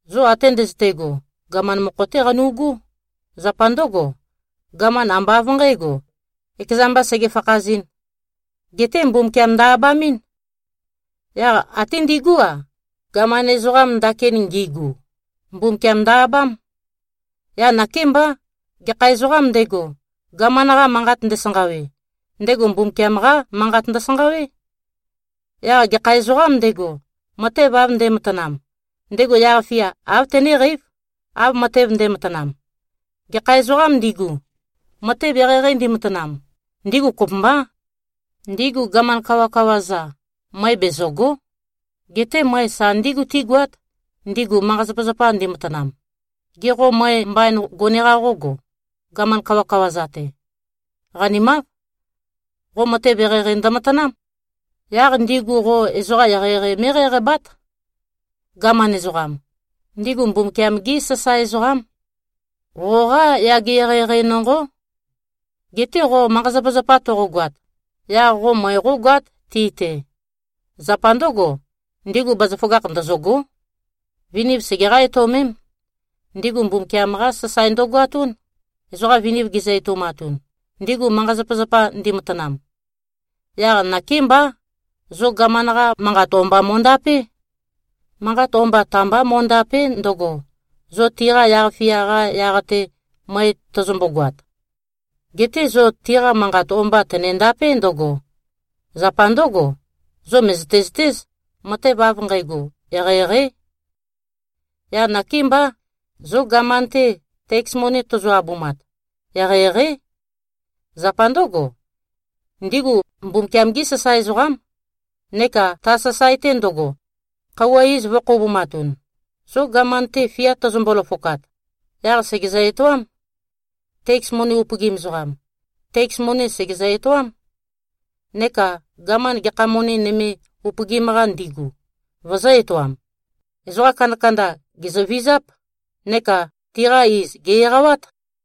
Zo ate ndøzøte꞉go, gaman mokho-té qanu꞉gú. Zapa ndǿgo, gaman ambá av nqǣgo, ekeza mbā sege-fakhazɨ̄n. Geté Mbumbukiam ndø-abamɨ́n. Yaq até ndigú-a, gaman ezoqam ndakin ngigu, Mbumbukiam ndø-abám. Yaq nakémbá, gekha ezoqām ndego, gaman-qa manqat ndesanqawe, ndego Mbumbukiam-qá manqat ndøsanqawé. Yaq gekha ezoqām ndego, matev av nde꞉matanam, ndego yaq-fia āv tenéqeív, av matev nde꞉matanam. Gekha ezoqām ndigu, matev eqeieqei ndimatanam, ndigu kopømbá. Ndigu gaman kawakawa-za, møe bezø̀go᷄. Geté møe sa ndígu tígoát, ndigu manqa-zapazapa ndimatanam. Gê, qo møe mbain gone-qa qógo, gaman kawakawa-za-te? Qanimáv. Qo matev eqeieqei ndømatanám. Yaq ndigu qo ezoqa eqeieqei mé꞉qæqabát. Gaman ezoqam, ndigu Mbumbukiam-gí sasae ezoqám. Qoqá yage eqeieqei nonqó. Geté qo manqa-zapazapa toqogoat, yaq qo møe qógoát, ti-te. Zapa ndǿgo, ndigu bazaføgakh ndøzø̂gó. Viniv segeqá-etøomém. Ndigu Mbumbukiam-qá sasae ndøgoatún, ezoqa viniv gizø-etoumatun, ndigu manqa-zapazapa ndimatanam. Yaq nakémbá, zo gaman-qa manqat o-mba mo꞉ndapé. Manqat o-mba ta-mbá mo꞉ndàpe᷄ ndøgo, zo tiqa yaq-fia-qa yaq-te møe tozombo-goat. Geté zo tiqa manqat o-mba tønendapé ndǿgo: Zapa ndǿgo, zo mø̀zøte-zøtéz, matev av nqægo eqeieqeí. Yaq nakémbá, zo gaman-te teks moni tozo-abumat, eqeieqeí. Zapa ndǿgo, ndigu Mbumbukiam-gí sasae ezoqám, neka ta sasae-te ndøgo, khøuwa iz vø̄-khoubumatun. Zo gaman-te fia tøzømbo-løfokat, yaq sègezø-etoám. Teks moni upøgim ezoqam, teks moni sègezø-etoám. Neka gaman, gekha moni nøme upøgim-qa ndigu, vøzø̄-etoam. Ezoqa kandakanda, gèzøvizáp, neka tiqa iz, gè-eqawát.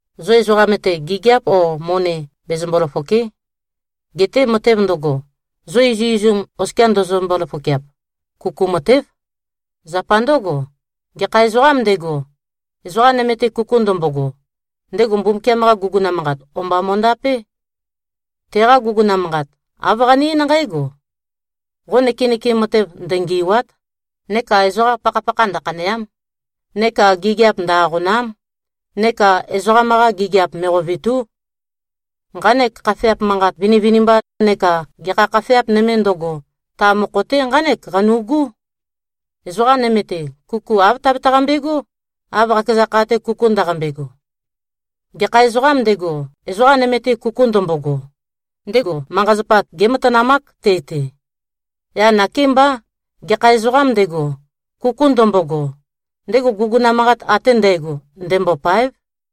Zo ezoqam-te, gigiap o moni bezømbø-løfòke᷄. Geté matev ndøgo, zo izuizum oskia ndøzømbo-løfokeap, kuku matév. Zapa ndǿgo, gekha ezoqām ndego, ezoqa nøme-te kuku ndømbogo, ndego Mbumbukiam-qa guguna manqat o-mba mo꞉ndapé. Teqa guguna manqat, āv qane-eín nqǽgo, “Qo nøkenøkem matev ndøngì꞉wa᷄t,” neka “Ezoqa pakhapakha ndøkhanèa᷄m,” neka “Gigiap ndø-aqòna᷄m,” neka “Ezoqam-qa gigiap me꞉qovètu᷄.” Nqanek khafeap manqat vinivinimba neka gekha khafeap nøme ndøgo, ta mokho-te nqánek qanu꞉gú, “Ezoqa nøme-te, kuku āv tabetaqambe꞉gó, av qakeza kha-te kuku ndaqambe꞉go.” Gekha ezoqām ndego, ezoqa nøme-te kuku ndømbogo, ndego manqa-zapa gématanamák te-te. Yaq nakémbá, gekha ezoqām ndego, kuku ndømbogo, ndego guguna manqat ate ndægo, ndembôpáev.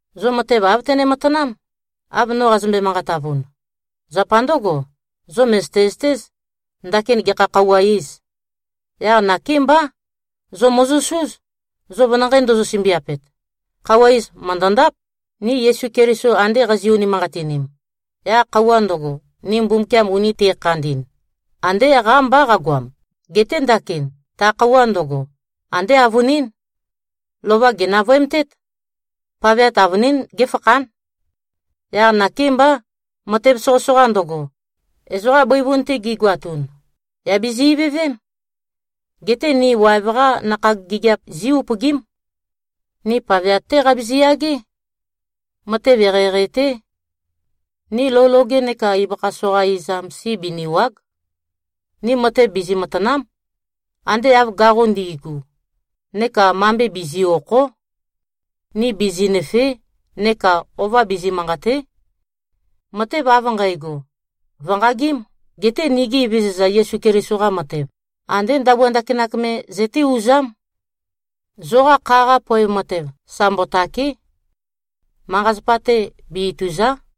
Zo matev āv tøne-matanám, av no qazømbe-manqatavun. Zapa ndǿgo, zo mø̀zøte-zøtéz, ndakin gekha khøuwa iz. Yaq nakémbá. Zo mòzosúz, zo venanqei ndozo-sømbiapet. Khøuwa iz mø̀ndøndáp. Ni Yesu Keliso ande qazi꞉-unimanqatinim, yaq khøuwa ndøgo, ni Mbumbukiam uni te꞉khandi꞉n, andé qámbá qagoam. Geté ndakin, ta khøuwa ndøgo, andé avønín. Lova gènavøemtét. Paveat avønín géfakhán. Yaq nakémbá, matev soqøsoqa ndøgo, ezoqa bøivun-te gigoatun, yà bizi-ivøvém. Geté ni waev-qá nakhag gigiap zí-upøgím. Ni paveat-té qabizi-yagé. Matev eqeieqei-té. Ni lou loge neka ibøkha soqa izam si binìwa᷄g. Ni matev bizi-matàna᷄m, ande av gaqo ndi꞉gu, neka mambe bizi꞉-òkho᷄. Ni bizinø̀fee᷄ neka ova bizi-manqàte᷄. Matev av nqægo, vø̀nqagím. Geté nigi Evezøza Yesu Keliso-qa matev, andé ndabua ndakinak me zøté-uzám. Zoqa kha-qa poev matev sa mbotàke᷄. Manqa-zapa-te be-itùza᷄.